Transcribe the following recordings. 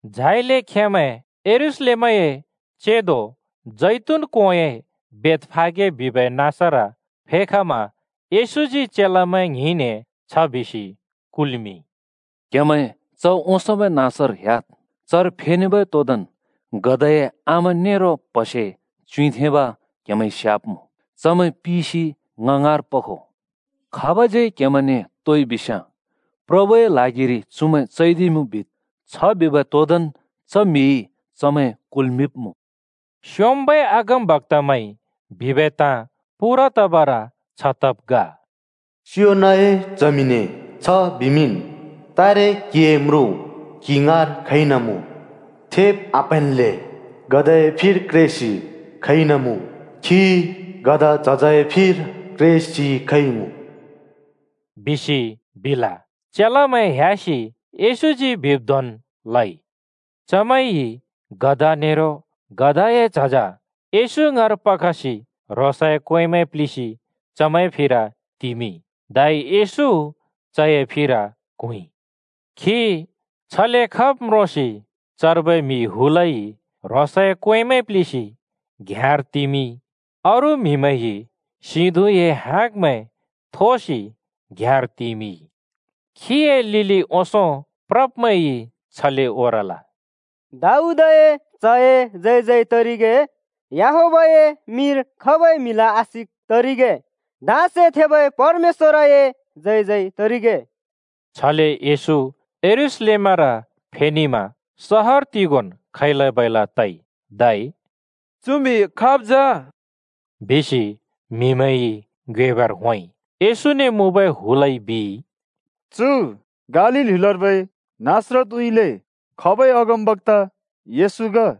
झाइले खेंमैं यरूशलेमए चेंदो जैतून कोंए बेथफागे बिबै नाँसर फेखमा येशूजी चेलामैं ङ्हिंने छ बिसि कुल्‍मिंइ, “क्‍हेमैं च ओंसोंबै नाँसर ह्‍याद्। चर फेनेबै तोदोंन् गधाए आमा नेरो प्हसे च्युँइँथेंब क्हेमैंइ स्‍याब्‍मुँ। चमैं पिसि ङ ङाँर पखो। खाबज्‍यै क्‍हेमैंने तोइ बिस्‍याँ, ‘प्रभुए ल्हागिरि चुमैं चैदिइमुँ’ बिद्। छ बिबै तोदोंन् च म्‍हिइ चमैं कुल्मिंब्‍मुँ।” स्योंम्बै अगमबक्‍ताइ बिबै ताँ पूरा तबर छ तब् ग। “सियोनए च्हमिने छ बिमिंन्, तारे क्‍हिए म्रुँ क्‍हि ङाँर खइन मुँ, थेब् आप्‍हैंन्‍ले गधाए फिर क्रेसि खइन मुँ, खी गधा झजए फिर क्रेसि खइमुँ,” बिसि बिल। चेलामैं ह्‍यासि येशूजी बिब् धोंन् लइ। चमैंइ गधा नेरो गधाए झज येशू ङाँर पखसि ह्रोंसए क्‍वेंमैं प्लिसि चमैंए फिर तिमिंइ। धै येशू चए फिर क्हुँइ। खी छले खब् म्रोंसि चर्बै म्‍हि हुलइ ह्रोंसए क्‍वेंमैं प्‍लिसि घ्‍याँर तिमिंइ। अरू म्‍हिमैंइ सिं धुँए हाँगमैं थोसि घ्‍याँर तिमिंइ। खीए लिलि ओंसों प्रब्मैंइ छले ओरल, “दाऊदए च्हए जय जय तरिगे! याहवेहए मिंर खबै म्‍हिला आशिक तरिगे! धाँसे थेबै परमेश्‍वरए जय जय तरिगे!” छले येशू यरूशलेमर फेनेमा सहर तिगोंन् खैला-बैला तइ। धै “चु म्हि खाब् जा?” बिसि म्हिमैंइ ङ्योएबर होंइ। येशूने मुँबै हुलइ बिइ, “चु गालील ह्‍युलर्बै नासरतउँइँले खबै अगमबक्‍ता येशू ग।”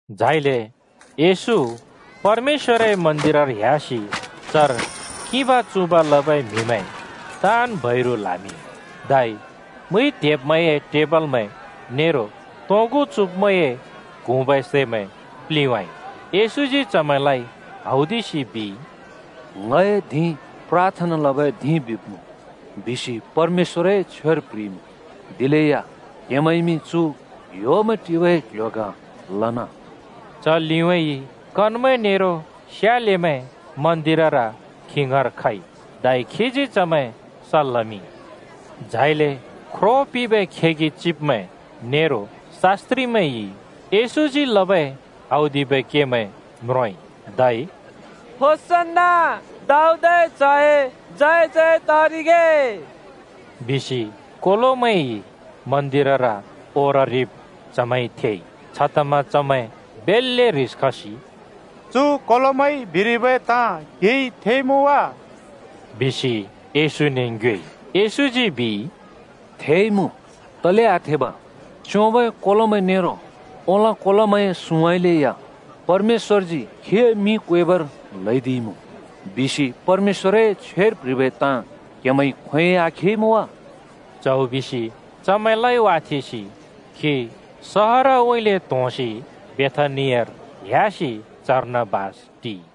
झाइले येशू परमेश्‍वरए मन्दिरर ह्‍यासि चर किंबा-चुँब लबै म्‍हिमैं ताँन् बैरु ल्हामिंइ। धै मुइ त्हेब्मैंए टेबलमैं नेरो तोंगु चुँब्मैंए क्हुँबै सैमैं प्लिंवाँइ। येशूजी चमैंलाइ हौदिसि बिइ, “‘ङए धिं प्राथना लबै धिं बिब्मुँ,’ बिसि परमेश्‍वरए छ्वेर प्‍ह्रिइमुँ। दिलेया क्‍हेमैंइमि चु ह्‍योमैं टिबै क्ल्ह्‍यो ग लना।” च लिउँइँ कनमैं नेरो स्यालेमैं मन्दिरर खी ङाँर खइ, धै खीजी चमैं सल् लमिंइ। झाइले ख्रो पिंबै खेगि चिब्मैं नेरो शास्‍त्रिमैंइ येशूजी लबै औदिबै केमैं म्रोंइ, धै “दाऊदए च्हए जय जय तरिगे!” बिसि कोलोमैंइ मन्दिरर ओररिब् चमैंइ थेइ। छतमा चमैं बेल्‍ले ह्रिस खसि “चु कोलोमैंइ बिरिबै ताँ क्‍हिइ थेइमुँ वा?” बिसि येशूने ङ्योएइ। येशूजी बिइ, “थेइमुँ, तले आथेब! ‘च्‍योंबै कोलोमैं नेरो ओलाँ कोलोमैंए सुँउँइँले या परमेश्‍वरजी खीए मिं क्वेबर ल्हैदिइमुँ,’ बिसि परमेश्‍वरए छ्वेर प्ह्रिबै ताँ क्‍हेमैंइ खोंयोंइ आखेइमुँ वा?” च्हौ बिसि चमैंलाइ वाथेंसि खी सहरउँइँले त्‍होंसि बेथानियार ह्‍यासि चर्न बास टिइ।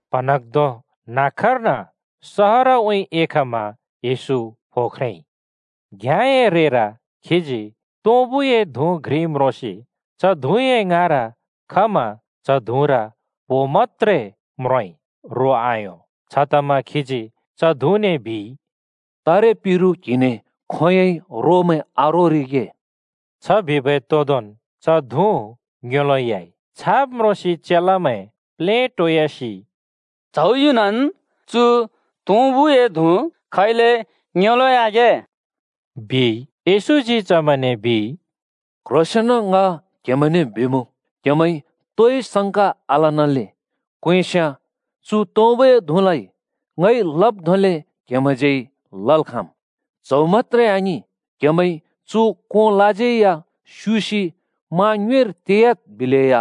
प्‍हँन्हाँग्धों न्‍हाँक्‍कर्न सहरउँइँ एखमा येशू फो ख्रेंइ। घ्याँए रेर खीजी तुँबुए धुँ घ्रि म्रोंसि च धुँए ङाँर खमा च धुँर प्‍हो मत्‍त्रे म्रोंइ रो आयों। छतमा खीजी च धुँने बिइ, “तारे पिरु क्‍हिने खोंयोंइ रोमैं आरोरिगे।” छ बिबै तोदोंन् च धुँ ङ्योंलोंयाइ। छाब् म्रोंसि चेलामैं प्लेटोयासि “च्‍हौ युनन् चु तुँबुए धुँ खैले ङ्योंलोंयागे?” बिइ। येशूजी चमैंने बिइ, “क्ह्रोंसेंन ङ क्हेमैंने बिमुँ, क्‍हेमैंइ तोइ संका आलनाले क्वेंस्‍याँ चु तुँबुए धुँलाइ ङइ लब् धोंले क्हेमैंज्यै लल् खाँम्। च्‍हौ मत्‍त्रे आङिं, क्‍हेमैंइ चु कोंलाज्यै या ‘स्युसि मा ङ्युँइर तेयाद्’ बिलेया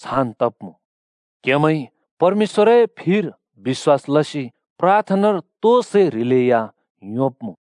छान् तब्‍मुँ। क्हेमैंइ परमेश्‍वरए फिर बिश्‍वास लसि प्राथनानर तो सै ह्रिलेया योंब्‍मुँ।”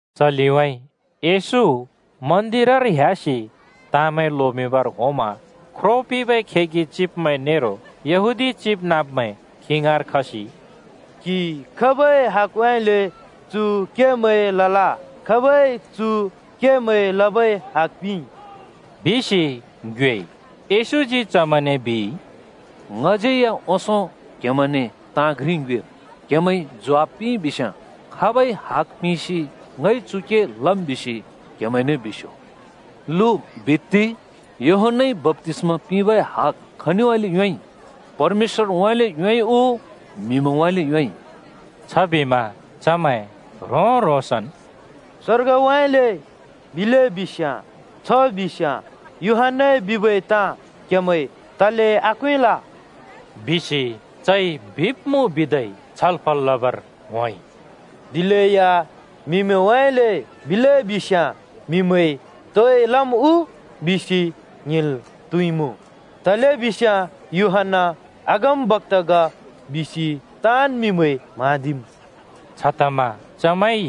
च लिउँइँ येशू मन्दिरर ह्‍यासि ताँमैं लोमिंबर होंमा ख्रो पिंबै खेगि चिब्मैं नेरो यहूदी चिबनाँब्मैं खी ङाँर खसि “क्हिइ खाबै हगउँइँले चु केमैं लल? खाबइ चु केमैं लबै हग पिंइ?” बिसि ङ्योएइ। येशूजी चमैंने बिइ, “ङज्‍यैया ओंसों क्‍हेमैंने ताँ घ्रि ङ्योएम्। क्‍हेमैंइ ज्वाफ पिंइबिस्‍याँ, खाबइ हग पिंसि ङइ चु के लम् बिसि क्हेमैंने बिस्‍यो। लु बित्ति! यूहन्‍नाइ बप्‍तिस्‍मा पिंबै हग खनिउँइँले योंइ? परमेश्‍वरउँइँले योंइ उ म्‍हिमैंउँइँले योंइ?” छबिमा चमैं ह्रों-ह्रोंसन्, “स्वर्गउँइँले बिले बिस्याँ ‘छ बिस्‍याँ यूहन्‍नाइ बिबै ताँ क्‍हेमैंइ तले आक्वेंल?’ बिसि चइ बिब्मुँ बिदै छलफल लबर होंइ। दिलेया ‘म्हिमैंउँइँले’ बिले बिस्‍याँ म्हिमैंइ तोइ लम् उ बिसि ङ्हिंल् त्हुइमुँ। तलेबिस्याँ यूहन्‍ना अगमबक्‍ता ग बिसि ताँन् म्हिमैंइ म्हाँदिम्।” छतमा चमैंइ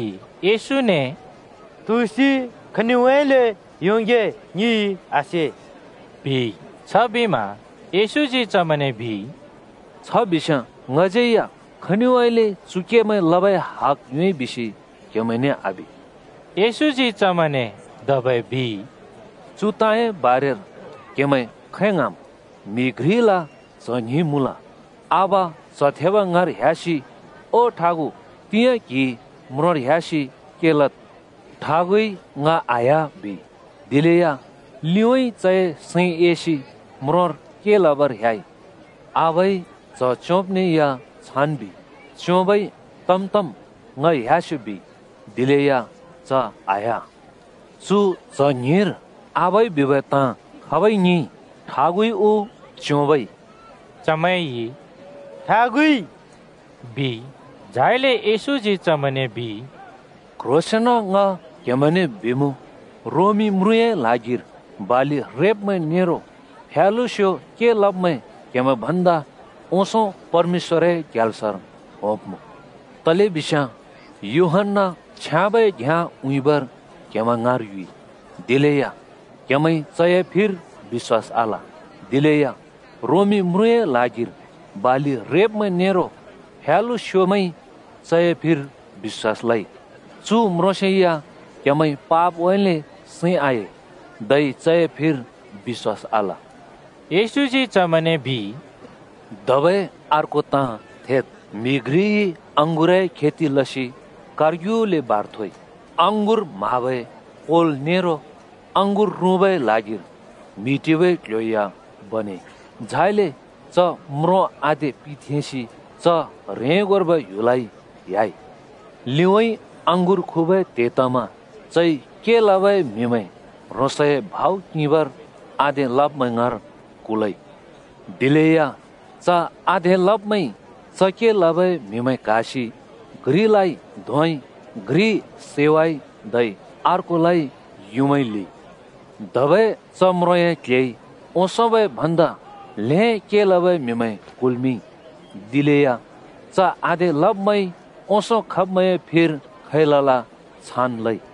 येशूने “तुसि, खनिउँइँले योंगे ङिइ आसे,” बिइ। छबिमा येशूजी चमैंने बिइ, “छ बिस्‍याँ ङज्यै या खनिउँइँले चु केमैं लबै हग योंइ बिसि क्‍हेमैंने आबि।” येशूजी चमैंने धबै बिइ, “चु ताँए बारेर क्‍हेमैं खै ङ्हाँम्? म्‍हि घ्रिला च्‍ह ङ्हिं मुँल। आबा च्‍ह थेब ङाँर ह्‍यासि ‘ओ ठागु, तिंयाँ क्‍हि म्रोंर ह्‍यासि के लद्,’ बिमा ठागुइ ‘ङ आह्‍या,’ बिइ। दिलेया लिउँइँ चए सैं एसि म्रोंर के लबर ह्‍याइ। “आबाइ च्‍ह च्‍योंब्‍ने या छान् बिइ। च्‍योंबइ ‘तम् तम्, ङ ह्‍यास्‍यो,’ बिइ दिलेया च आह्‍या। “चु च्‍ह ङ्हिंर आबाइ बिबै ताँ खाबइ ङिंइ? ठागुइ उ च्‍योंबइ?” चमैंइ “ठागुइ,” बिइ। झाइले येशूजी चमैंने बिइ, “क्ह्रोंसेंन ङ क्हेमैंने बिमुँ, रोमी म्रुँए ल्हागिर बालि रेब्मैं नेरो फ्यालुस्यो के लब्मैं क्‍हेमैं भन्दा ओंसों परमेश्‍वरए ग्याल्सर होंब्मुँ। तलेबिस्याँ यूहन्‍ना छ्याँबै घ्‍याँ उँइँबर क्‍हेमैं ङाँर युँइ, दिलेया क्‍हेमैंइ चए फिर बिश्‍वास आल। दिलेया रोमी म्रुँए ल्हागिर बालि रेब्मैं नेरो फ्यालुस्योमैंइ चए फिर बिश्‍वास लइ। चु म्रोंसेया क्हेमैंइ पापउँइँले सैं आए, धै चए फिर बिश्‍वास आल।” येशूजी चमैंने बिइ, “धबै अर्को ताँ थेद्। म्‍हि घ्रिइ अँगुरए खेति लसि कारग्युले बार थोइ। अँगुर म्‍हाबै कोल नेरो अँगुर रुँबै ल्हागिर म्हि टिबै क्ल्ह्‍यो या बनेइ। झाइले च म्रों आधे पिथेंसि च ह्रेंगोर्बै ह्‍युलउँइँ ह्‍याइ। “लिउँइँ अँगुर खुबै त्हे तमा चइ के लबै म्‍हिमैं ह्रोंसए भाउ किंबर आधे लब्मैं ङाँर कुल्‍मिंइ। दिलेया च आधे लब्मैंइ च के लबै म्‍हिमैं क्‍हासि घ्रिलाइ धोंइ, घ्रि सैवाइ, धै अर्कोलाइ युँमाइ ल्हिइ। धबै च म्रोंए क्‍ल्‍हेइ ओंसोंबै भन्दा ल्हें के लबै म्‍हिमैं कुल्‍मिंइ। दिलेया च आधे लब्‍मैंइ ओंसों खब्‍मैंए फिर खै लल छान् लइ।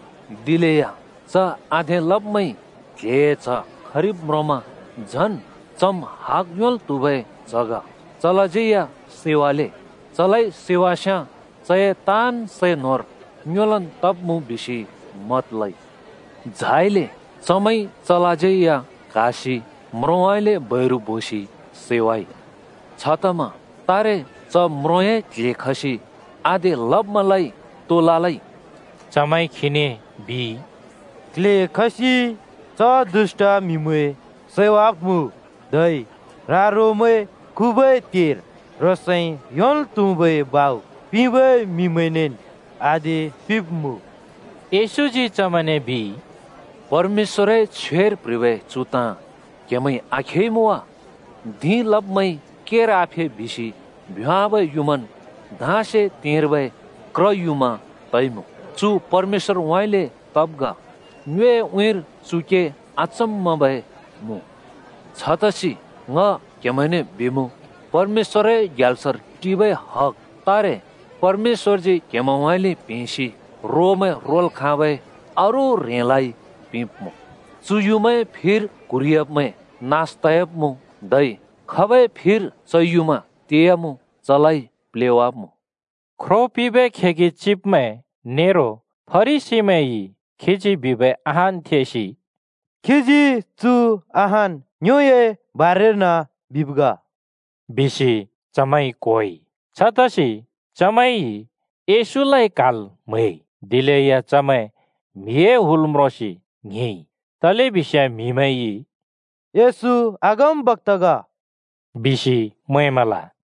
दिलेया च आधे लब्‍मैंइ क्ल्हेए च्‍ह खरिब् म्रोंमा ‘झन्, चम् हग योंल् त्‍हुबै च्‍ह ग। चलाज्यै या सैवाले! चलाइ सैवास्‍याँ चए ताँन् सै न्होर ङ्योलन् तब्मुँ,’ बिसि मत लइ। झाइले चमैंइ चलाज्यै या क्‍हासि म्रोंउँइँले बैरु बोसि सैवाइ। “छतमा तारे च म्रोंए क्‍ल्‍हे खसि आधे लब्‍मैंलाइ तो ललै?” चमैंइ खीने बिइ, “क्ल्हे खसि च दुष्‍ट म्‍हिमैं सैवाब्‍मुँ। धै रा-रोमैं खुबै त्हेर ह्रोंसइ योंल् त्हुबै भाउ पिंबै म्हिमैंनेन् आधे पिंब्मुँ।” येशूजी चमैंने बिइ, “परमेश्‍वरए छ्वेर प्‍ह्रिबै चु ताँ क्‍हेमैंइ आखेइमुँ वा? ‘धिं लब्‍मैंइ केर आफे बिसि भ्योंवाबै युँमान् धाँसे तेंर्बै क्र युँमा तइमुँ। चु परमेश्‍वरउँइँले तब् ग। ङ्योए उँइँर चु के आचम्‍मबै मुँ।’ छतसि ङ क्‍हेमैंने बिमुँ, परमेश्‍वरए ग्याल्सर टिबै हग तारे परमेश्‍वरजी क्‍हेमैंउँइँले प्‍हेंसि रोमैं रोल् खाँबै अरू ह्रेंलाइ पिंब्‍मुँ।” [चु युँमाए फिर क्‍हुरिह्‍याब्मैं नास तयाब्मुँ, धै खाबै फिर च युँमा तेयामुँ चलाइ प्लेवाब्‍मुँ।] ख्रो पिंबै खेगि चिब्मैं नेरो फरिसीमैंइ खीजी बिबै अहान् थेसि “खीजी चु अहान् ङ्योए बारेर्न बिब् ग,” बिसि चमैंइ क्होइ। छतसि चमैंइ येशूलाइ क्‍हाल् म्‍हैइ, दिलेया चमैं म्‍हिए हुल म्रोंसि ङ्हिंइ। तलेबिस्याँ म्हिमैंइ “येशू अगमबक्‍ता ग,” बिसि मैंमल।